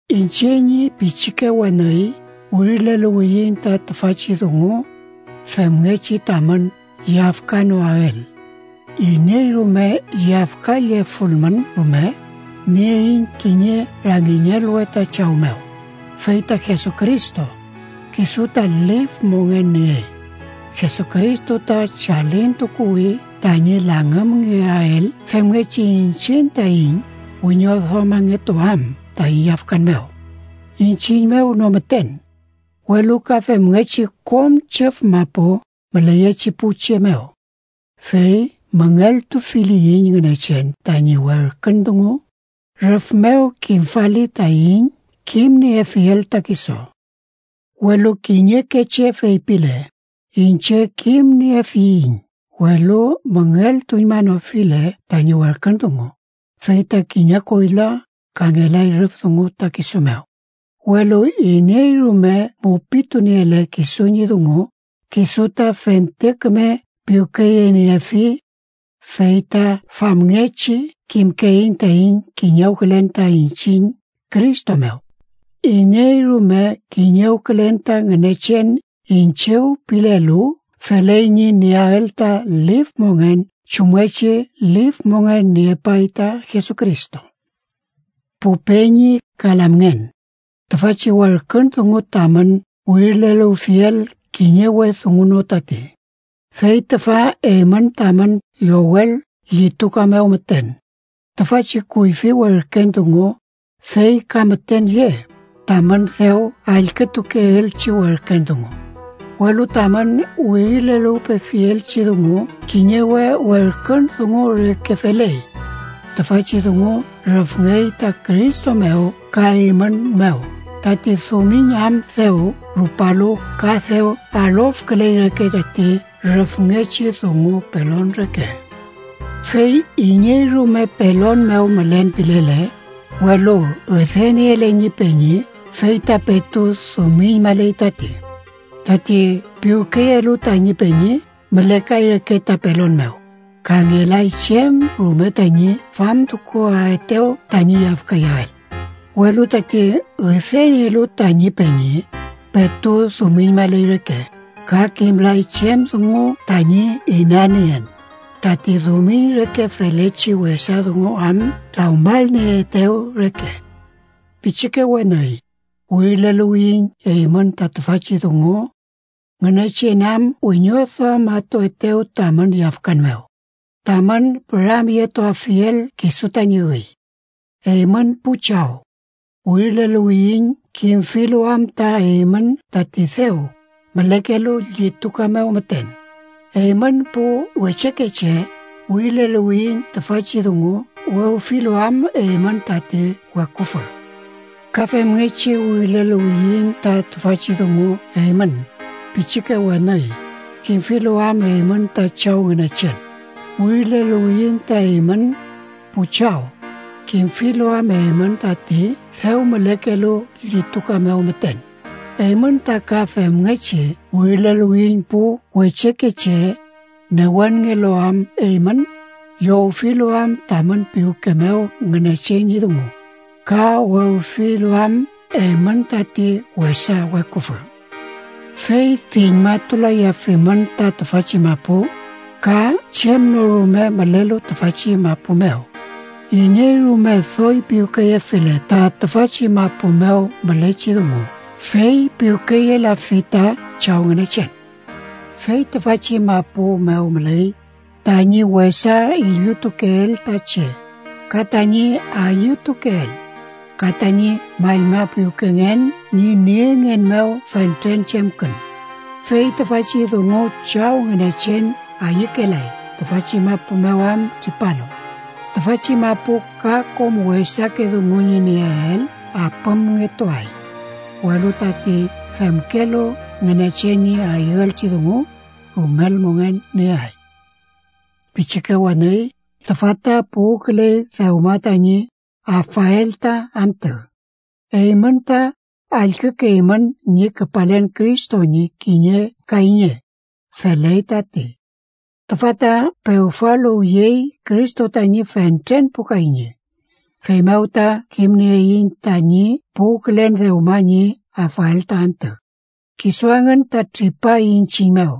Iñche ñi pichike weni, wirileluwiyiñ ta tüfachi dungu femngechi tamün yafkanoael. Iney rume yafkallefulmün rume, nieiñ kiñe rangiñelwe ta Chaw mew, fey ta Jesucristo, kisu ta lif mongen niey. Jesucristo ta chalintukuwi tañi langümngeael femngechi iñchiñ taiñ wiñoduamangetuam taiñ yafkan mew. Iñchiñ mew no müten, welu ka femngechi kom chüf mapu müleyechi pu che mew. Fey müngeltufiliyiñ Ngünechen tañi werkün dungu, rüf mew kimfali taiñ kimniefiel ta kisu. Welu kiñeke che feypile: “Iñche kimniefiñ”, welu müngeltuñmanofile tañi werkün dungu, fey ta kiñe koyla, ka ngelay rüf dungu ta kisu mew. Welu iney rume mupituniele kisu ñi dungu, kisu ta fente küme piwkeyeniefi, fey ta famngechi kimkeiñ taiñ kiñewkülen ta iñchiñ Cristo mew. Iney rume kiñewkülen ta Ngünechen iñchiw pilelu, feley ñi nieael ta lif mongen chumngechi lif mongen niepay ta Jesucristo. Pu peñi ka lamngen, tüfachi werkün dungu tamün wirileluwfiel kiñe we dungu no tati, fey tüfa eymün tamün llowel llituka mew müten. Tüfachi kuyfi werken dungu fey ka müten lle, tamün dew allkütukeelchi werken dungu. Welu tamün wirileluwpefielchi dungu kiñe we werkün dungu reke feley. Tüfachi dungu rüfngey ta Cristo mew ka eymün mew, tati dumiñ am dew rupalu ka dew alofküley reke tati rüfngechi dungu pelon reke. Fey iney rume pelon mew mülen pilele, welu üdeniele ñi peñi, fey ta petu dumiñmaley tati. Tati piwkeyelu tañi peñi mülekay reke ta pelon mew, ka ngelay chem rume tañi famtukuaetew tañi yafkayael. Welu tati üdenielu tañi peñi, petu dumiñmaley reke, ka kimlay chem dungu tañi inanien, tati dumiñ reke felechi wesa dungu am trawmalnieetew reke. Pichike weni, wirileluwiyiñ eymün ta tüfachi dungu Ngünechen am wiñoduamatuetew tamün yafkan mew, tamün püramyetuafiel kisu tañi üy. Eymün pu chaw, wirileluwiyiñ kimfilu am ta eymün tati dew mülekelu llituka mew müten. Eymün pu wechekeche, wirileluwiyiñ tüfachi dungu wewfilu am eymün tati weküfü. Ka femngechi wirileluwiyiñ ta tüfachi dungu eymün, pichike weni, kimfilu am eymün ta Chaw Ngünechen. Wirileluwiyiñ ta eymün, pu chaw, kimfilu am eymün tati dew mülekelu llituka mew müten. Eymün ta ka femngechi wirileluwiyiñ pu wechekeche, newenngelu am eymün, llowfilu am tamün piwke mew Ngünechen ñi dungu, ka wewfilu am eymün tati wesa weküfü. Fey diñmatulayafimün ta tüfachi mapu, ka chem no rume mülelu tüfachi mapu mew. Iney rume doy piwkeyefile ta tüfachi mapu mew mülechi dungu, fey piwkeyelafi ta Chaw Ngünechen. Fey tüfachi mapu mew müley: tañi wesa illutukeel ta che, ka tañi ayütukeel, ka tañi mallmapiwkengen ñi niengen mew fentren chemkün. Fey tüfachi dungu Chaw Ngünechen ayükelay, tüfachi mapu mew am tripalu. Tüfachi mapu ka kom wesake dungu ñi nieel apümngetuay, welu tati femkelu Ngünechen ñi ayüelchi dungu, rumel mongen nieay. Pichike weni, tüfa ta puwküley dewma tañi afael ta antü. Eymün ta allkükeymün ñi küpalen Cristo ñi kiñe kayñe. Feley tati. Tüfa ta pewfaluwyey Cristo tañi fentren pu kayñe. Feymew ta kimnieiñ tañi puwkülen dewma ñi afael ta antü. Kisu engün ta tripay iñchiñ mew,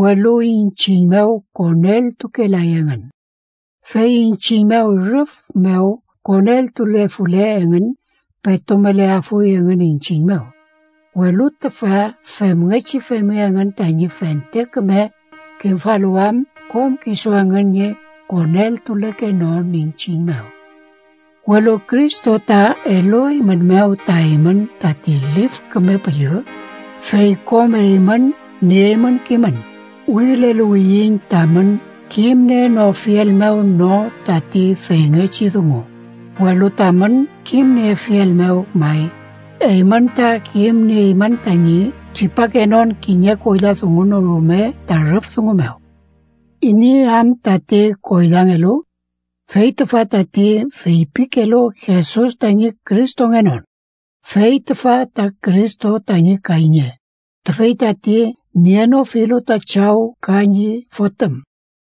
welu iñchiñ mew koneltukelay engün. Fey iñchiñ mew rüf mew koneltulefule engün, petu müleafuy engün iñchiñ mew. Welu tüfa femngechi femi engün tañi fente küme kimfaluwam kom kisu engün ñi koneltulekenon iñchiñ mew. Welu Cristo ta elueymünmew ta eymün tati Lif Küme Püllü, fey kom eymün nieymün kimün. Wirileluwiyiñ tamün kimnienofiel mew no tati feyngechi dungu, welu tamün kimniefiel mew may. Eymün ta kimnieymün tañi tripakenon kiñe koyla dungu no rume ta rüf dungu mew. ¿Iney am tati koylangelu? Fey tüfa tati feypikelu Jesus tañi Cristongenon. Fey tüfa ta Cristo tañi kayñe, tüfey tati nienofilu ta Chaw ka ñi Fotüm.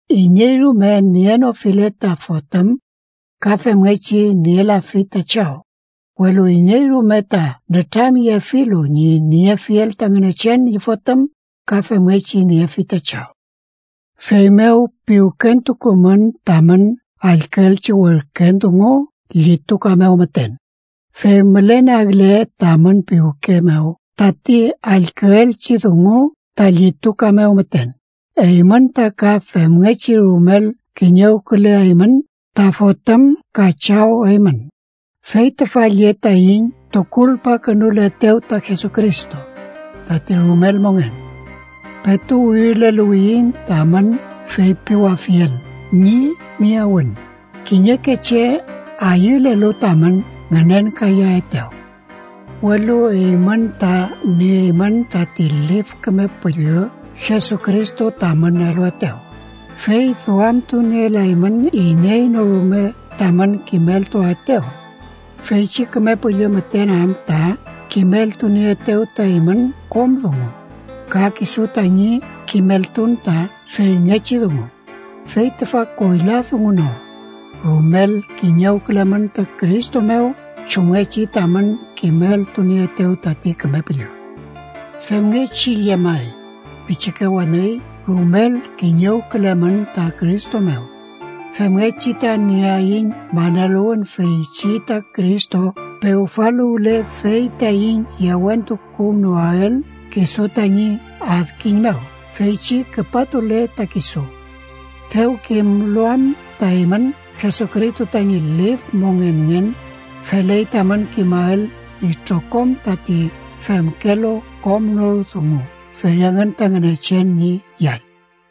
Iney rume nienofile ta Fotüm, ka femngechi nielafi ta Chaw. Welu iney rume ta nütramyefilu ñi niefiel ta Ngünechen ñi Fotüm, ka femngechi niefi ta Chaw. Feymew piwkentukumün tamün allküelchi werken dungu llituka mew müten. Fey mülenagle tamün piwke mew tati allküelchi dungu ta llituka mew müten, eymün ta ka femngechi rumel kiñewküleaymün ta Fotüm ka Chaw eymün. Fey tüfa lle taiñ tukulpakünuletew ta Jesucristo: tati rumel mongen. Petu wirileluwiyiñ tamün feypiwafiel ñi miyawün kiñeke che ayülelu tamün ngünenkayaetew. Welu eymün ta nieymün tati Lif Küme Püllü Jesucristo tamün eluetew, fey duamtunielaymün iney no rume tamün kimeltuaetew, feychi Küme Püllü müten am ta kimeltunieetew ta eymün kom dungu, ka kisu tañi kimeltun ta feyngechi dungu, fey tüfa koyla dungu no. Rumel kiñewkülemün ta Cristo mew chumngechi tamün kimeltunieetew tati Küme Püllü. Femngechi llemay, pichike weni, rumel kiñewkülemün ta Cristo mew, femngechi ta nieaiñ maneluwün feychi ta Cristo pewfaluwle fey taiñ yewentukuwnoael kisu tañi adkiñ mew feychi küpatule ta kisu. Dew kimlu am ta eymün Jesucristo tañi lif mongenngen, feley tamün kimael itrokom tati femkelu kom nor dungu fey engün ta Ngünechen ñi yall.